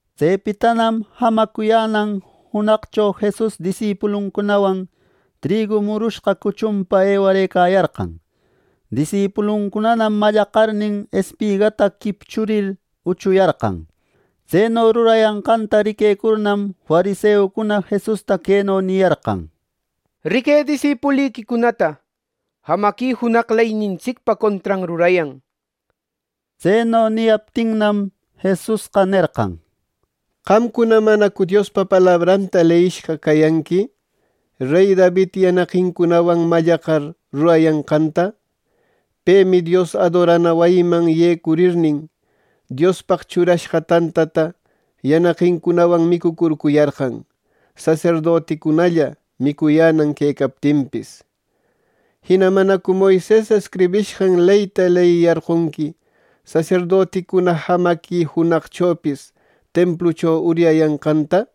Tsepitanam jamacuyänan junaqcho Jesus disipuluncunawan trigu murushqa cuchunpa ewarëcayarqan. Disipulucunanam mallaqarnin, espigata quipchurir uchuyarqan. Tseno rurayanqanta riquecurnam, fariseucuna Jesusta queno niyarqan: —¡Riquë disipuliquicunata! ¡Jamaqui junaq leynintsicpa contran rurayan! Tseno niyaptinnam, Jesusqa nerqan: —¿Qamcuna manacu Diospa palabranta leyishqa cayanqui, rey David yanaqincunawan mallaqar, rurayanqanta? Pemi Dios adorana wayiman yecurirnin, Diospaq churashqa tantata yanaqincunawan micucurcuyarqan, saserdoticunalla micuyänan quecaptinpis. Jina ¿manacu Moises escribishqan leyta leyiyarqonqui saserdoticuna jamaqui junaqchopis templucho uryayanqanta?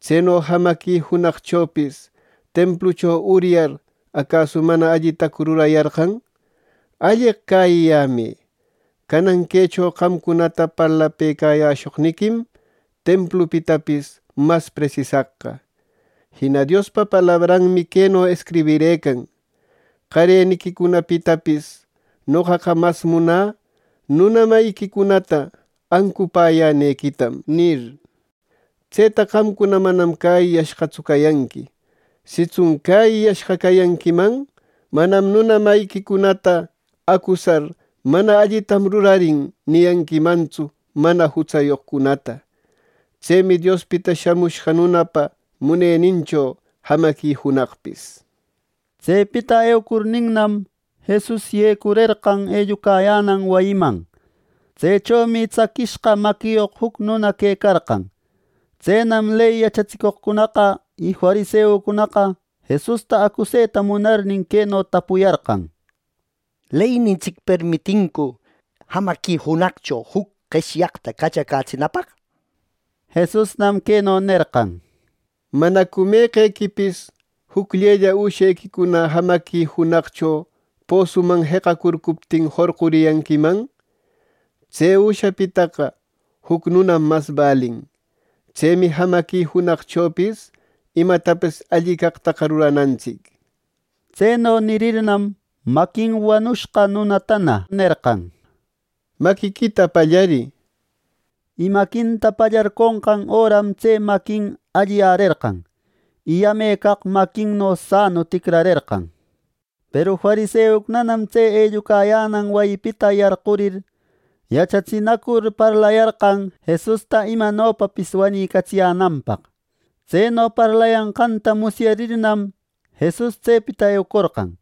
¿Tseno jamaqui junaqchopis templucho uryar acasu mana allitacu rurayarqan! Alleq cäyiyämë. Canan quecho qamcunata parlapëcayäshoqniquim templupitapis mas presisaqqa. Jina Diospa palabranmi queno escribirëcan: ‘Qareniquicunapitapis noqaqa mas munä nuna mayiquicunata ancupäyänequitam’ nir. Tseta qamcuna manam cäyiyashqatsu cayanqui, sitsun cäyiyashqa cayanquiman, manam nuna mayiquicunata acusar ‘Mana allitam rurarin’ niyanquimantsu mana jutsayoqcunata. Tsemi Diospita Shamushqa Nunapa munenincho jamaqui junaqpis. Tsepita eucurninnam, Jesus yecurerqan ellucayänan wayiman. Tsechomi tsaquishqa maquiyoq juc nuna quecarqan. Tsenam ley yachatsicoqcunaqa y fariseucunaqa, Jesusta acuseta munarnin queno tapuyarqan: —¿Leynintsic permitincu jamaqui junaqcho juc qeshyaqta cachacätsinapaq? —nir. Jesusnam queno nerqan: —¿Manacu meqequipis jucllella ushequicuna jamaqui junaqcho posuman jeqacurcuptin jorquriyanquiman? Tse üshapitaqa juc nunam mas balin. Tsemi jamaqui junaqchopis imatapis alli caqtaqa ruranantsic —nir. Tseno nirirnam, maquin wanushqa nunatana, “Maquiquita pallarï” nerqan. Y maquinta pallarconqan öram tse maquin alliyärerqan, y yame caq maquinno sanu ticrarerqan. Peru fariseucunanam tse ellucayänan wayipita yarqurir, yachatsinacur parlayarqan Jesusta imanopapis wanicatsiyänanpaq. Tseno parlayanqanta musyarirnam, Jesus tsepita eucorqan.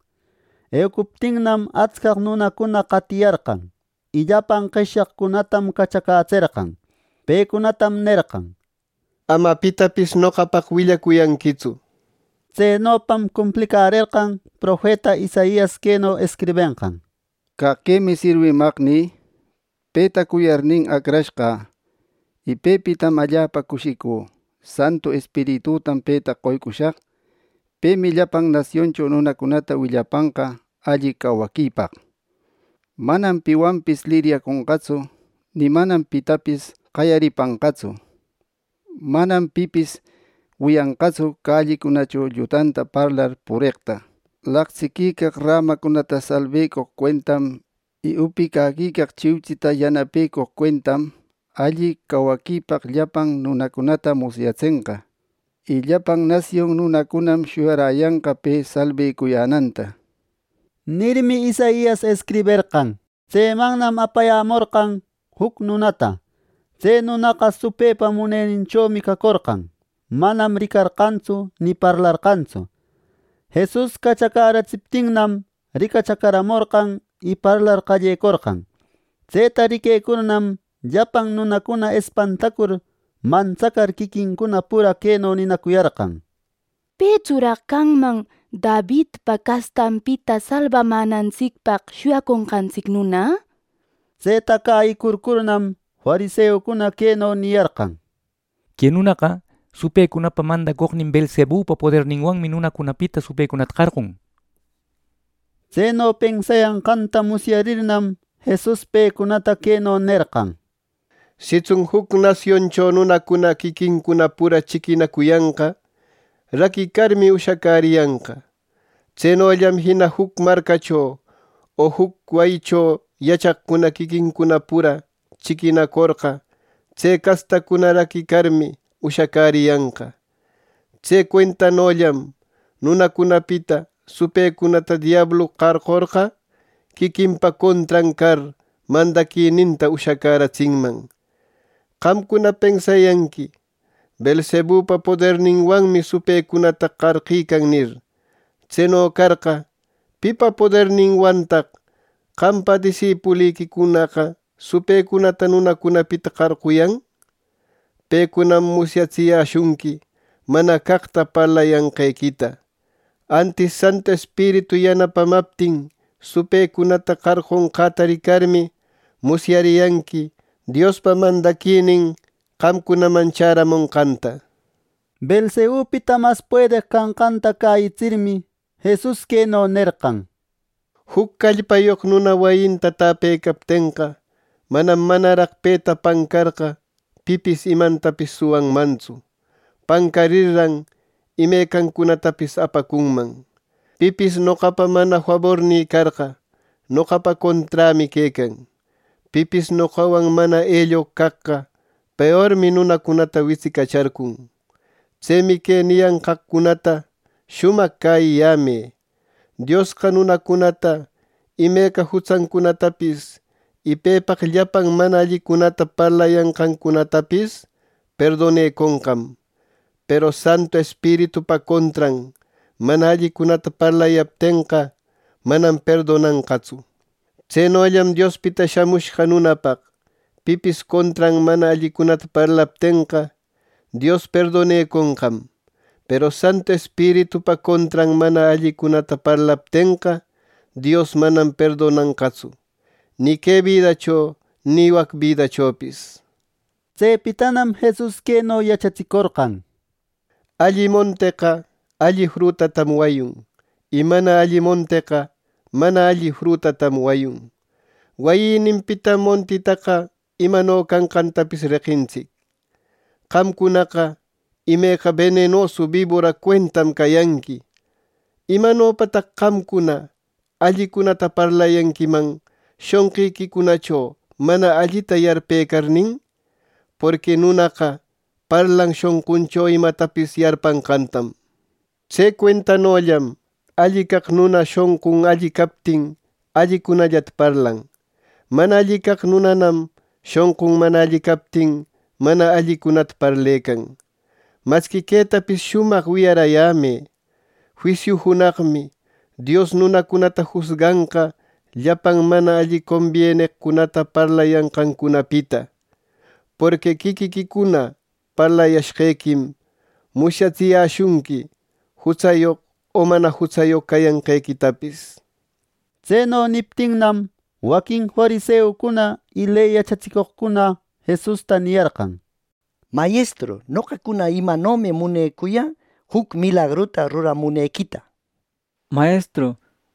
Eucuptinnam, atscaq nunacuna qatiyarqan, y llapan qeshyaqcunatam cachacätserqan. Pecunatam nerqan: —Ama pitapis noqapaq willacuyanquitsu —nir. Tsenopam cumplicärerqan profeta Isaias queno escribenqan: “Caq quemi sirwimaqnï. Petam cuyarnin acrashqä, y pepitam allapa cushicü. Santu Espiritütam peta qoycushaq. Pemi llapan nasioncho nunacunata willapanqa alli cawaquipaq. Manam piwanpis liryaconqatsu, ni manam pitapis qayaripanqatsu. Manam pipis wiyanqatsu callicunacho llutanta parlar pureqta. Laqtsiquicaq rämacunata salbecoq cuentam y upicaquicaq chiuchita yanapecoq cuentam, alli cawaquipaq llapan nunacunata musyatsenqa. Y llapan nasion nunacunam shuyaräyanqa pe salbecuyänanta” nirmi, Isaias escriberqan. Tsemannam apayämorqan juc nunata. Tse nunaqa supëpa muneninchomi cacorqan; manam ricarqantsu ni parlarqantsu. Jesus cachacäratsiptinnam, ricachacaramorqan y parlar qallecorqan. Tseta riquecurnam, llapan nunacuna espantacur, mantsacar quiquincuna pura queno ninacuyarqan: —¿Petsuraq canman Davidpa castanpita salbamänantsicpaq shuyaconqantsic nuna? —nir. Tseta cayïcurcurnam fariseucuna queno niyarqan: —Que nunaqa supëcunapa mandacoqnin Beelzebupa poderninwanmi nunacunapita supëcunata qarqun —nir. Tseno pensayanqanta musyarirnam, Jesus pecunata queno nerqan: “Sitsun juc nasioncho nunacuna quiquincuna pura chiquinacuyanqa, raquicarmi, ushacäriyanqa. Tsenollam jina juc marcacho o juc wayicho yachaqcuna quiquincuna pura chiquinacorqa, tse castacuna raquicarmi, ushacäriyanqa. Tse cuentanollam nunacunapita supëcunata diablu qarqorqa, quiquinpa contran car mandaquininta ushacäratsinman. Qamcuna pensayanqui ‘Beelzebupa poderninwanmi supëcunata qarqican’ nir. Tseno carqa, ¿Pipa poderninwantaq qampa disipuliquicunaqa supëcunata nunacunapita qarquyan? Pecunam musyatsiyäshunqui mana caqta parlayanqequita. Antis Santu Espiritu yanapamaptin supëcunata qarqunqäta ricarmi musyariyanqui Diospa mandaquinin qamcunaman chäramonqanta.” ˻Beelzebupita mas puedeq canqanta cäyitsirmi˼ Jesus queno nerqan: “Juc callpayoq nuna wayinta täpecaptenqa, manam manaraq peta pancarqa pipis imantapis suwanmantsu. Pancarirran imecancunatapis apacunman. “Pipis noqapa mana fabornï carqa, noqapa conträmi quecan. Pipis noqawan mana elloq caqqa; peormi nunacunata witsicacharcun. “Tsemi que niyanqaqcunata shumaq cäyiyämë: Diosqa nunacunata imeca jutsancunatapis, y pepaq llapan mana allicunata parlayanqancunatapis perdoneconqam; peru Santu Espiritupa contran mana allicunata parlayaptenqa, manam perdonanqatsu. Tsenollam Diospita Shamushqa Nunapaq, pipis contran mana allicunata parlaptenqa, Dios perdoneconqam; peru Santu Espiritupa contran mana allicunata parlayaptenqa, Dios manam perdonanqatsu, ni que bidacho ni wac bidachopis.” Tsepitanam Jesus queno yachatsicorqan: “Alli monteqa alli frutatam wayun, y mana alli monteqa mana alli frutatam wayun. Wayïnimpitam montitaqa imano canqantapis reqintsic. ¡Qamcunaqa imeca benenosu bibora cuentam cayanqui! ¿Imanopataq qamcuna allicunata parlayanquiman, shonqiquicunacho mana allita yarpëcarnin! Porqui nunaqa parlan shonquncho imatapis yarpanqantam. Tse cuentanollam alli caq nuna shonqun alli captin, allicunallata parlan; mana alli caq nunanam shonqun mana alli captin, mana allicunata parlecan. Masqui quetapis shumaq wiyaräyämë: Juisiu junaqmi Dios nunacunata jusganqa llapan mana combieneqcunata parlayanqancunapita. Porqui quiquiquicuna parlayashqequim musyatsiyäshunqui, jutsayoq o mana jutsayoq cayanqequitapis.” Tseno niptinnam, waquin fariseucuna y ley yachatsicoqcuna Jesusta niyarqan: —Mayestru, noqacuna imanomi munecuyä juc milagruta ruramunequita —nir.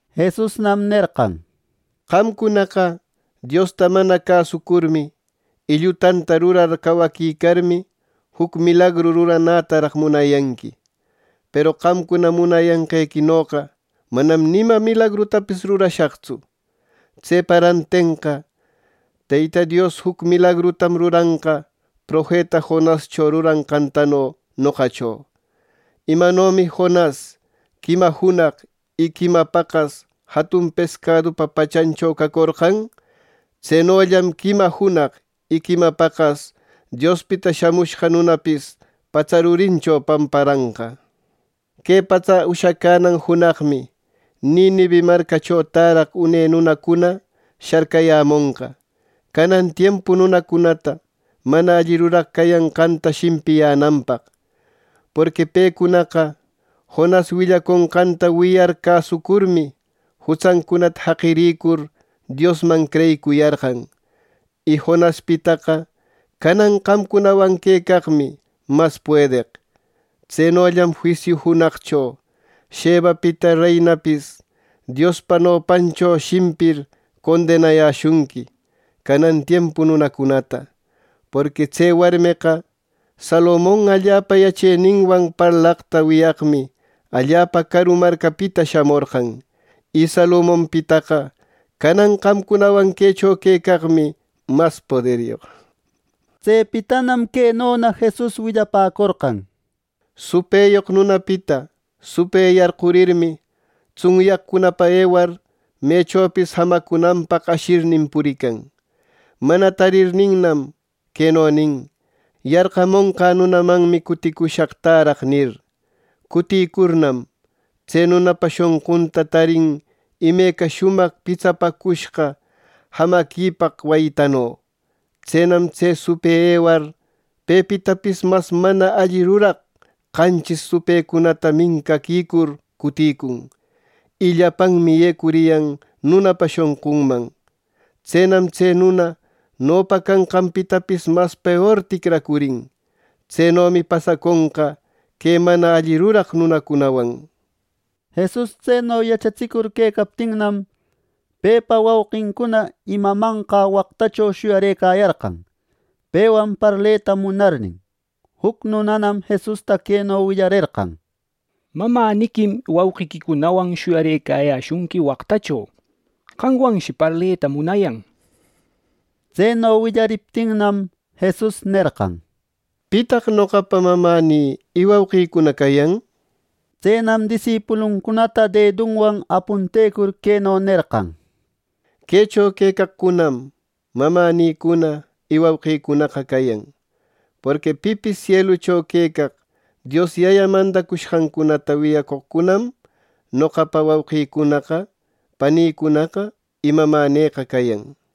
Jesusnam nerqan: —¡Qamcunaqa Diosta mana cäsucurmi y llutanta rurar cawaquicarmi, juc milagru ruranätaraq munayanqui! Peru qamcuna munayanqequinoqa manam ima milagrutapis rurashaqtsu. Tsepa rantenqa Teyta Dios juc milagrutam ruranqa profeta Jonascho ruranqantano noqacho. Imanomi Jonas quima junaq y quima paqas jatun pescadupa pachancho cacorqan, tsenollam quima junaq y quima paqas Diospita Shamushqa Nunapis, patsa rurincho pamparanqa. Que patsa ushacänan junaqmi Ninive marcacho täraq une nunacuna sharcayämonqa, canan tiempu nunacunata mana alli ruraq cayanqanta shimpiyänanpaq. Porqui pecunaqa Jonas willaconqanta wiyar cäsucurmi, jutsancunata jaqirïcur Diosman creyicuyarqan. Y Jonaspitaqa canan qamcunawan quecaqmi mas puedeq. Tsenollam juisiu junaqcho, Shebapita reinapis Diospa nopancho shimpir condenayäshunqui canan tiempu nunacunata. Porqui tse warmeqa Salomon allapa yacheninwan parlaqta wiyaqmi allapa caru marcapita shamorqan, y Salomonpitaqa canan qamcunawan quecho quecaqmi mas poderyoq. Tsepitanam quenona Jesus willapäcorqan: “Supëyoq nunapita supë yarqurirmi, tsunyaqcunapa ewar, mechopis jamacunanpaq ashirnin purican. Mana tarirninnam, queno nin: ‘Yarqamonqä nunamanmi cuticushaq täraq’ nir. Cutïcurnam, tse nunapa shonqunta tarin imeca shumaq pitsapäcushqa jayaquicaq wayitano. Tsenam tse supë ewar pepitapis mas mana alli ruraq qanchis supëcunata mincaquicur cutïcun, y llapanmi yecuriyan nunapa shonqunman. Tsenam tse nuna nopa canqanpitapis mas peor ticracurin. Tsenomi pasaconqa que mana alli ruraq nunacunawan.” Jesus tseno yachatsicur quecaptinnam, pepa wauqincuna y mamanqa waqtacho shuyarëcayarqan, pewan parleta munarnin. Juc nunanam Jesusta queno willarerqan: —Mamäniquim wauqiquicunawan shuyarëcayäshunqui waqtacho. Qamwanshi parleta munayan —nir. Tseno willariptinnam, Jesus nerqan: —¿Pitaq noqapa mamänï y wauqïcuna cayan! Tsenam disipuluncunata dedunwan apuntecur queno nerqan: —Quecho quecaqcunam mamänïcuna y wauqïcunaqa cayan. Porqui pipis sielucho quecaq Dios Yayä mandacushqancunata wiyacoqcunam noqapa wauqïcunaqa panïcunaqa y mamänïqa cayan —nir.